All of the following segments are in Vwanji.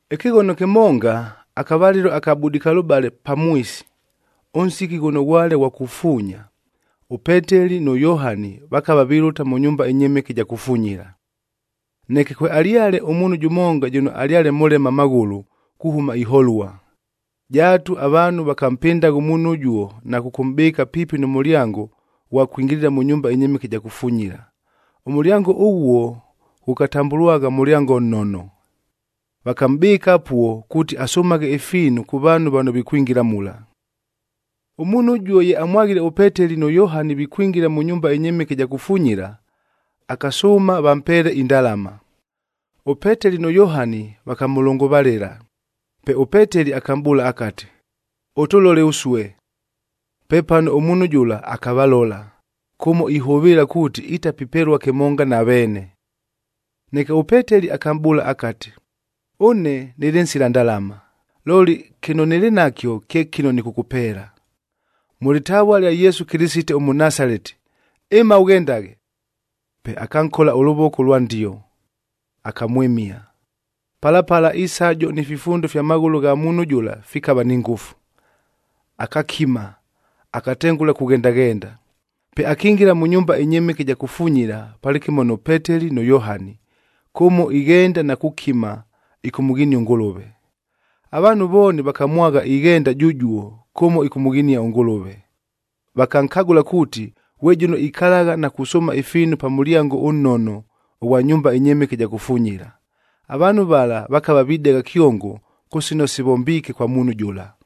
Ɨkɨghono kɨmonga, akavalɨlo aka budikalʉbale pamwisi, ʉnsiki ghʉno ghwale ghwa kufuunya, ʉPeteli nʉ Yohani vakava vilʉta mʉ nyumba ɨnyɨmɨke ɨja kufunyila. Neke kwealyale ʉmuunhu jʉmonga jʉno alyale mʉlema amaghʉlʉ kuhʉma iholua. Jaatu avaanhu vakampɨndagha ʉmuunhu ʉjuo na kʉkʉmʼbɨɨka piipi nʉ mʉlyango ghwa kwingilila mʉ nyumba ɨnyɨmɨke ɨja kufunyila. Ʉmʉlyango ʉghuo ghʉkatambʉlwagha Mʉlyango Nnono. Vakamʼbɨkagha apuo kuuti asʉmaghe ifiinu kʉ vaanhu vano vikwingila mula. Ʉmuunhu ʉjuo ye amwaghile ʉPeteli nʉ Yohani vikwingila mʉ nyumba ɨnyɨmɨke ɨja kufunyila, akasʉʉma vampeele indalama. ɄPeteli nʉ Yohani vakamʉlʉngʉvalɨla, pe ʉPeteli akamʼbʉʉla akati, “Ʉtʉlole ʉsue!” Pepano ʉmuunhu jʉla akavalola, kʉmo ihʉvɨɨla kuuti itapipelua kɨmonga na veene. Neke ʉPeteli akamʼbʉʉla akati, “Ʉne nɨlɨ nsila ndalama,a looli kɨno nɨlɨ nakyo kye kɨno nɨkʉkʉpeela. Mʉ lɨtavua lya Yesu Kɨlɨsite ʉMʉnasaleti, ɨma ʉghendaghe!” Pe akankola ʉlʉvoko ʉlwa ndio, akamwɨmia. Pala pala isajo ni fifundo fya maghʉlʉ gha muunhu jʉla fikava ni ngʉfu. Akakima, akatengʉla kughendaghenda. Pe akingila mʉ nyumba ɨnyɨmɨke ɨja kufunyila palɨkɨmo nʉ Peteli nʉ Yohani, kʉmo ighenda na kukima ɨkʉmʉghinia ʉNgʉlʉve. Avaanhu vooni vakamwagha ighenda jʉjuo kʉmo ɨkʉmʉghinia ʉNgʉlʉve. Vakankagʉla kuuti, ghwe jʉno ikalagha na kusʉʉma ifiinu pa Mʉlyango ʉNnono ʉghwa nyumba ɨnyɨmɨke ɨja kufunyila. Avaanhu vala vakava videgha kyongo kʉ sino sivombiike kwa muunhu jʉla.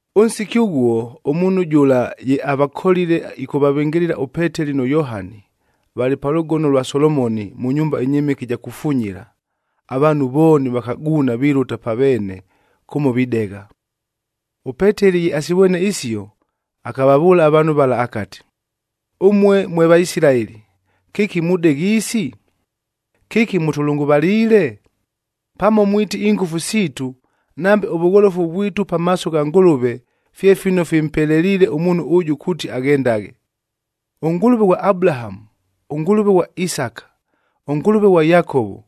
Ʉnsiki ʉghuo, ʉmuunhu jʉla ye avakolile ɨkʉvavɨngɨlɨla ʉPeteli nʉ Yohani, valɨ pa Lʉgono lwa Solomoni,b mʉ nyumba ɨnyɨmɨke ɨja kufunyila, avaanhu vooni vakaguuna vilʉta pa veene kʉmo videgha. ɄPeteli ye asivwene isio, akavavʉʉla avaanhu vala akati, “Ʉmue mwe Vaisilaeli, kɨki mudegha isi? Kɨki mʉtʉlʉngʉvaliile? Pamo mwiti ingʉfu siitu, nambe ʉvʉgholofu vwitu pamaaso gha Ngʉlʉve fye fino fimpeleliile ʉmuunhu ʉjʉ kuuti aghendaghe! ɄNgʉlʉve ghwa Abulahamu, ʉNgʉlʉve ghwa Isaka, ʉNgʉlʉve ghwa Yakovo,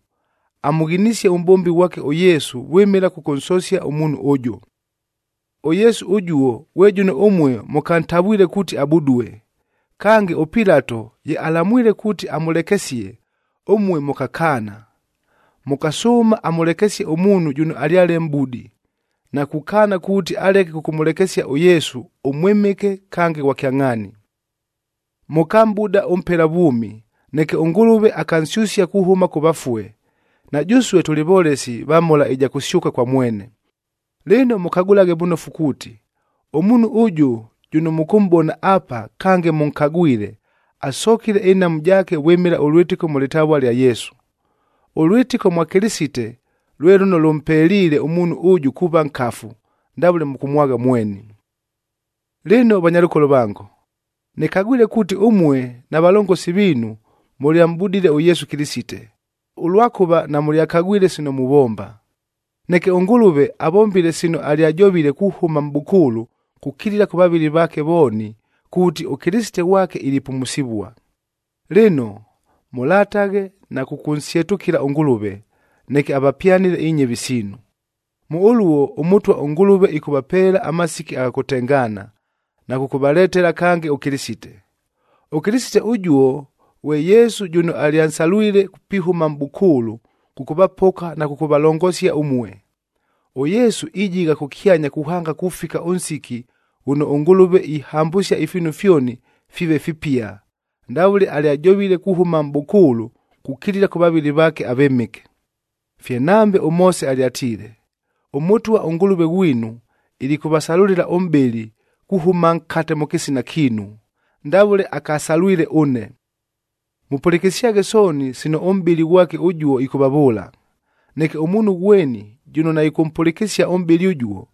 amʉghinisie ʉmʼbombi ghwake ʉYesu vwɨmɨla kʉkʉnsosia ʉmuunhu ʉjʉ. ɄYesu ʉjuo ghwe jʉno ʉmue mʉkantavwile kuuti abudue. Kange, ʉPilato ye alamwile kuuti amʉlekesie, ʉmue mʉkakaana. Mʉkasʉʉma amʉlekesie ʉmuunhu jʉno alyale mʼbudi, na kukaana kuuti aleke kʉkʉmʉlekesia ʉYesu ʉMwɨmɨke kange Ghwa Kyangʼhaani. Mʉkamʼbuda ʉmpela vwʉmi, neke ʉNgʉlʉve akansyʉsia kuhʉma kʉ vafue, na jʉsue tʉlɨ volesi va mhola ɨja kʉsyʉka kwa mwene. Lɨno mʉkagʉlaghe vʉnofu kuuti, ʉmuunhu ʉjʉ jʉno mʉkʉmʼbona apa kange mʉnkagwile, asokile ɨnhamu jaake vwɨmɨla ʉlwɨtɨko mʉ lɨtavua lya Yesu. Ʉlwɨtɨko mwa Kɨlɨsite lwe lʉno lʉmpeliile ʉmuunhu ʉjʉ kuuva nkafu, ndavʉle mʉkʉmwagha mweni. “Lɨno vanyalʉkolo vango, nɨkagwile kuuti ʉmue na valongosi viinu mʉlyamʼbudile ʉYesu Kɨlɨsite, ʉlwakʉva namʉlyakagwile sino muvomba. Neke ʉNgʉlʉve avombile sino alyajovile kuhʉma mʼbʉkʉʉlʉ kukilila kʉ vavɨli vaake vooni, kuuti ʉKɨlɨsite ghwake ilipumusivua. Lɨno, mʉlataghe na kʉkʉnsyetʉkɨla ʉNgʉlʉve, neke avapyanɨle inyɨvi siinu. Mʉ ʉluo ʉMʉtwa ʉNgʉlʉve ɨkʉvapeela amasiki agha kʉtengaana, na kʉkʉvaletela kange ʉKɨlɨsite. ɄKɨlɨsite ʉjuo ghwe Yesu jʉno alyansalwile pihʉma mʼbʉkʉʉlʉ kʉkʉvapoka na kʉkʉvalongosia ʉmue. ɄYesu ijigha kʉkyanya kuhanga kufika ʉnsiki ghʉno ʉNgʉlʉve ihambʉsia ifiinu fyoni fiive fipia, ndavʉle alyajovile kuhʉma mʼbʉkʉʉlʉ kukilila kʉ vavɨli vaake avɨmɨke. Fye nambe ʉMoose alyatiile, ‘ɄMʉtwa ʉNgʉlʉve ghwinu ilikʉvasalʉlɨla ʉmʼbɨli, kuhʉma nkate mʉ kɨsina kiinu, ndavʉle akasalwile ʉne. Mʉpʉlɨkɨsyaghe sooni sino ʉmʼbɨli ghwake ʉjuo ɨkʉvavʉʉla. Neke ʉmuunhu ghweni jʉno naɨkʉmpʉlɨkɨsia ʉmʼbɨli ʉjuo,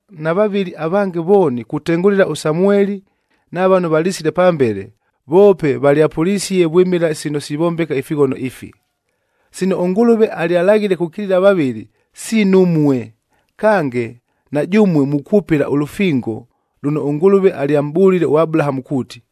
Na vavɨli avange vooni kutengʉla ʉSamueli na vano valisile pambele, voope valyapʉlisie vwɨmɨla sino sivombeka ifighono ifi. “Sino ʉNgʉlʉve alyalaghile kukilila avavɨli, siinu ʉmue. Kange, na jʉmue mukwʉpɨla ʉlʉfingod lʉno ʉNgʉlʉve alyamʼbʉlile ʉAbulahamue kuuti,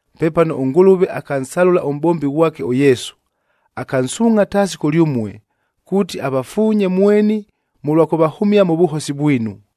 Pepano ʉNgʉlʉve akansalʉla ʉmʼbombi ghwake ʉYesu, akansuungʼha taasi kʉlyʉmue, kuuti avafuunye mweni mʉlwa kʉvahʉmia mʉ vʉhosi vwinu.”